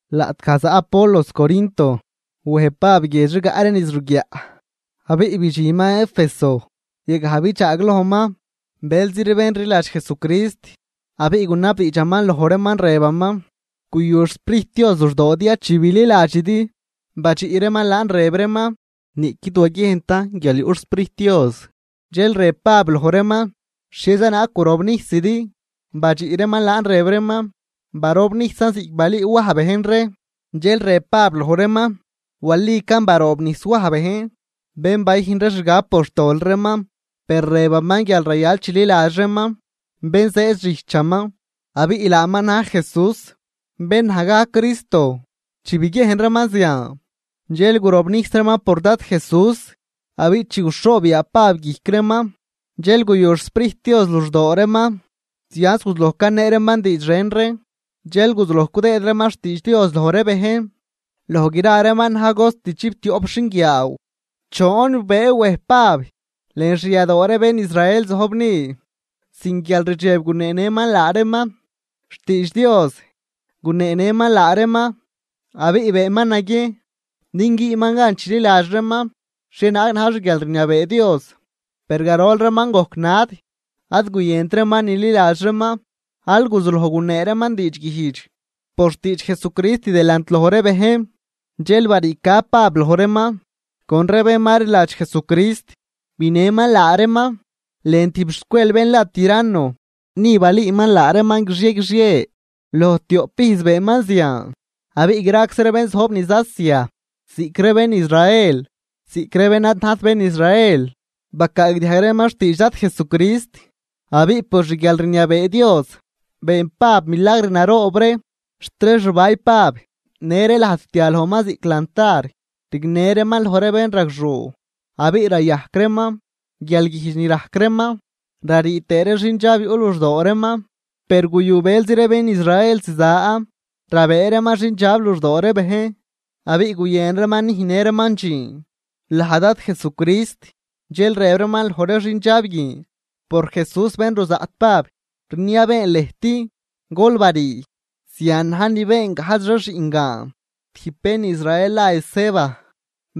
Laꞌtgaj zaꞌ Apolos Corinto, wej Pab guiedx rigaꞌ ree niz ruguiaꞌ, abiꞌ bidxinman Éfeso, yagaj bidxaaglojman bëlzi ree bén rliladx Jesucrist. Abiꞌ gunabdiidxaman loj reeman rëbaman: ―¿Guyu xSprijt Dios luxdoodi ya chi bililadxidi? Badxiꞌ reeman laan rëb reeman: ―Niꞌquid waguiejntan guial yuꞌ xSprijt Dios. Dxel rëb Pab loj reeman: ―¿Xhieza naag gurobnijsidi? Badxiꞌ reeman laan rëb reeman: ―Barobnijsan ziꞌc balüü Waj bejn ree. Dxel rëb Pab loj reeman: ―Walican baroobnijs Waj bejn, bén bayüjn ree xgab por xtol reeman. Per rëbaman guial rayal chililadx reeman bén zëëd xijchaman abiꞌ laaman na̱j Jesús, bén naj gajc Cristo. Chi biguiejn reeman zian, dxel gurobnijs reeman por Dad Jesús. Abiꞌ chi guxhoob yaa Pab guijc reeman, dxel guyu xSprijt Dios luxdoo reeman, zianz guzuloj canee reeman diidx ren ree. Dxel guzuloj cudëëd reeman xtiidx Dios loj ree bejn. Loj gra reeman na̱j cost chiptioꞌp xinguiaaw. Choon bëëw wej Pab lën xyadoo ree bén Israel zojb ni. Sin guialrdxeb guneenëman laa reeman xtiidx Dios, guneenëman laa reeman abiꞌ beenman naguiejn din güünman gan chililadx reeman xhienaag na̱j xguialrniabee Dios. Per garol reeman gojc nad ad guyënt reeman nililadx reeman, al guzuloj gunee reeman diidxguijdx por xtiidx Jesucrist delant loj ree bejn. Dxel bariica Pab loj reeman con ree bén ma rliladx Jesucrist, binëman laa reeman lën tijb xzcuel bén la Tiranno. Ni balüüman laa reeman guixie guixie, loj tioꞌp ijz beenman zian. Abiꞌ graczi ree bén zojb niz Asia, ziꞌc ree bén Israel ziꞌc ree bén ad najt bén Israel, bacaagdiajg reeman xtiidx Dad Jesucrist. Abiꞌ por xguialrniabee Dios been Pab milagr naroob ree, xt ree xbay Pab në ree lajd rtia lojman ziꞌc lantar rignë reeman loj ree bénragxuu, abiꞌ rayajc reeman guialguijdx ni rajc reeman, rarii tëë ree xindxab yuꞌ luxdoo reeman. Per guyu bëlzi ree bén Israel ziza rabëë reeman xindxab luxdoo ree bejn, abiꞌ guyën reeman nüjnnë reeman dxiin laj Dad Jesucrist dxel rëb reeman loj ree xindxab guin: ―¡Por Jesús bén ruzaꞌt Pab, rniabeen lëjt, gol barii! Zian na̱j ni been gajdx ree xiꞌngaan tijb bén Israel la Esceva,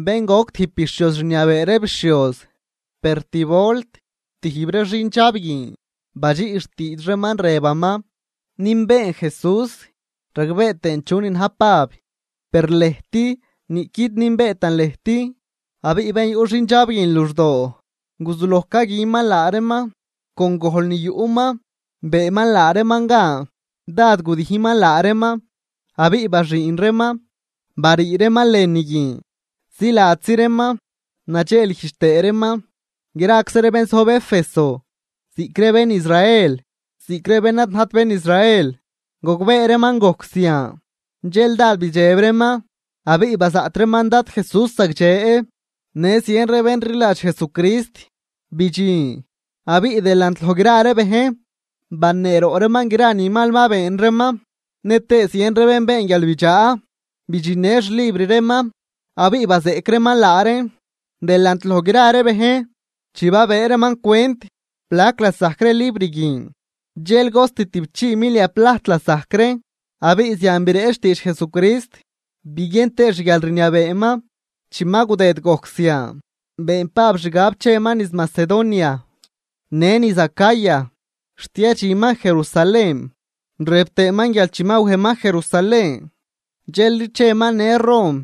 bén goc tijb bixhioz rniabee ree bixhioz. Per tib volt tijb ree xindxab guin badxiꞌ xtiidx reeman rëbaman: ―Nünbeen Jesús ragbee tëën chunin na̱j Pab, per lëjt niꞌquid nünbeetan lëjt. Abiꞌ bén yuꞌ xindxab guin luxdoo guzuloj caguinman laa reeman, con gojl ni yuꞌman beenman laa reeman gan. Dád gudijnman laa reeman abiꞌ baxüün reeman barii reeman lënü guin, ziladzi reeman nadxeelguijdx tëë reeman. Graczi ree bén zojb Éfeso, ziꞌc ree bén Israel ziꞌc ree bén ad najt bén Israel, gogbee reeman gojc zian, dxel dád bidxeb reeman abiꞌ bazaꞌt reeman Dad Jesús zagdxe. Në zien ree bén rliladx Jesucrist bidxin abiꞌ delant loj gra ree bejn baneeroꞌ reeman gra ni mal ma been reeman. Nëtëë zien ree bén been guialbidxaa bidxinnë xlibr reeman abiꞌ bazeꞌc reeman laa reen delant loj gra ree bejn. Chi babëë reeman cwent plac lasajc ree libr guin dxel cost tüꞌpchii mil milia plajt lasajc reen. Abiꞌ zian bireꞌch xtiidx Jesucrist biguien tëë xguialrniabeeman. Chi ma gudëd gojc zian, been Pab xgab cheman niz Macedonia në niz Acaya xt yadxinman Jerusalén. Rëb tëëman guial chi ma wejman Jerusalén dxelri cheman në Rom.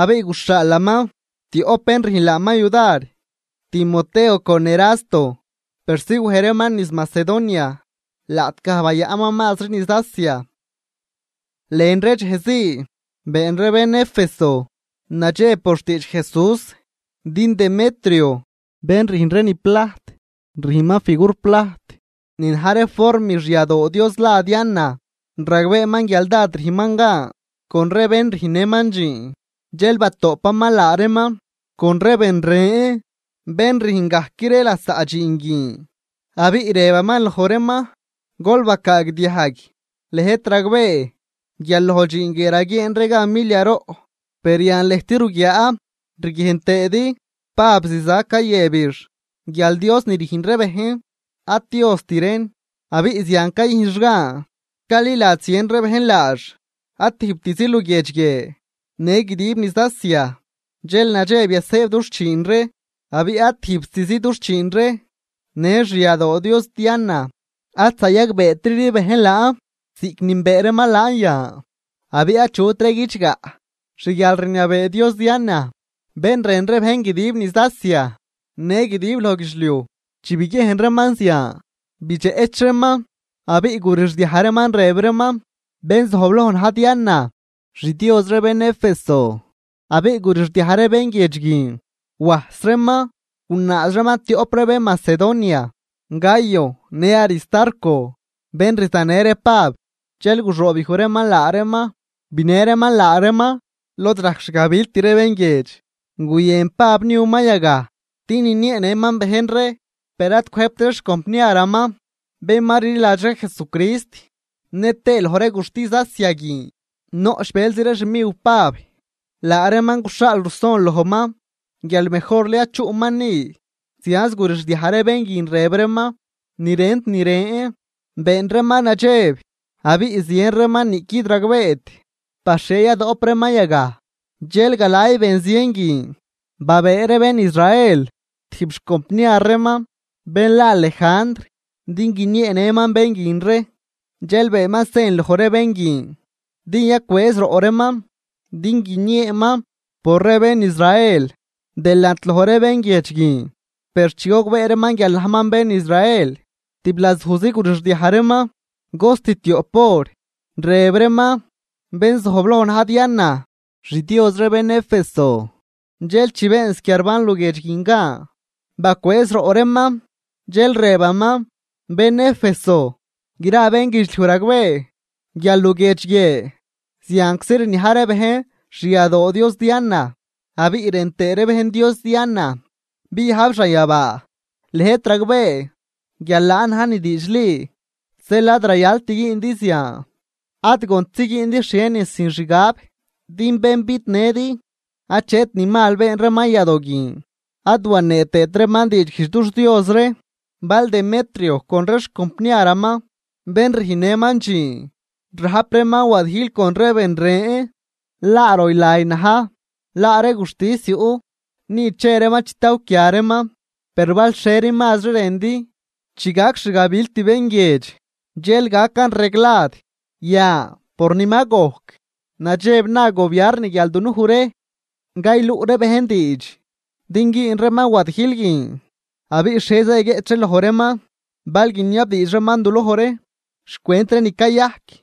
Abiꞌ guxhaalaman tioꞌp bén rüjn laaman yudar, Timoteo con Erasto, persi wej reeman niz Macedonia laꞌtgaj bayaꞌnman mazri niz Asia. Lën ree dxej zii been ree bén Éfeso nadxeb por xtiidx Jesús. Din Demetrio, bén rüjn ree ni plajt, rüjnman figur plajt ni na̱j ree form xyadoo dios la Diana, ragbeeman guial dád rüjnman gan con ree bén rüjnnëman dxiin. Dxel batoꞌpaman laa reeman con ree ben ren bén rüjn gajc ree lasaꞌ dxiin guin, abiꞌ rëbaman loj reeman: ―Gol bacaagdiajg, lëjt ragbee guial loj dxiin guie raguieen ree gan milia roꞌ. Per yan lëjt ruguiaa riguiejn tëëdi, Pab ziza cayëbix guial dios ni rüjn ree bejn ad diost reen. Abiꞌ zian cayujnx gan caliladx zien ree bejn laax, ad tijbtizi luguiedx guie, në guidib niz Asia. Dxel nadxeb yasëëb dux chiin ree, abiꞌ ad tijbtizi dux chiin ree, në xyadoo dios Diana ad zayagbeetri ree bejn laan ziꞌc nünbee reeman laan yan abiꞌ achutri guidxgaꞌ xguialrniabee dios Diana, bén rën ree bejn guidib niz Asia në guidib loj guidxliuj. Chi biguiejn reeman zian, bidxeꞌch reeman abiꞌ gurixdiaj reeman rëb reeman: ―¡Bén zojbloj na̱j Diana, xdios ree bén Éfeso! Abiꞌ gurixdiaj ree bén guiedx guin wajs reeman, gunaaz reeman tioꞌp ree bén Macedonia, Gayo në Aristarco, bén rzanë ree Pab. Dxel guxoobyuj reeman laa reeman, binë reeman laa reeman lod rajc xgabilt ree bén guiedx. Guyën Pab niuman yagaj din ninieenëman bejn ree, per ad cwëjbt ree xcompniaraman, bén ma rliladx ree Jesucrist. Nëtëë loj ree guxtis Asia guin noꞌch bëlzi ree xmiw Pab, laa reeman guxhaal ruson lojman guial mejorli ad chuꞌman ni. Zianz gurixdiaj ree bén guin rëb reeman ni rent ni ren, been reeman nadxeb abiꞌ zien reeman niꞌquid ragbeet par xhie badoꞌp reeman yagaj. Dxel galay ben zien guin babëë ree bén Israel tijb xcompniar reeman bén la Lejandr din guinieenëman bén guin ree. Dxel beenman sen loj ree bén guin din yacwëëz roꞌ reeman din guinieeman por ree bén Israel delant loj ree bén guiedx guin. Per chi gogbee reeman guial najman bén Israel, tiblazujzi gurixdiaj reeman cost tioꞌp hor, rëb reeman: ―¡Bén zojbloj na̱j Diana, xdios ree bén Éfeso! Dxel chi been squiarban luguiedx guin gan bacwëëz roꞌ reeman, dxel rëbaman: ―Bén Éfeso, gra bénguidxliuj ragbee guial luguiedx guie zianczi rniaj ree bejn xyadoo dios Diana abiꞌ rën tëë ree bejn dios Diana biajb xanyabaa. Lëjt ragbee guial laan na̱j ni diidxli, zeel ad rayalt güündi zian, ad gontzi güündi xhienin sin xgab. Din bén bidnëdi achet ni mal been reeman yadoo guin, ad wanee tëët reeman diidxguijdx dux dios ree. Bal Demetrio con ree xcompniaraman bén rüjnnëman dxiin rajp reeman wadijl con ree ben ren, laa roylay na̱j, laa ree guxtis yuꞌ, ni che reeman chitawquia reeman. Per bal xhieri mazri rëndi, chi gac xgabilt bén guiedx dxel gacan reglad. Yan, por ni ma gojc, nadxeb na gobiarn guial dunuj ree cayluꞌ ree bejn diidx din güün reeman wadijl guin, ¿abiꞌ xhieza yaguieꞌch ree loj reeman bal guiniabdiidx reeman duloj ree xcwent ree ni cayajc?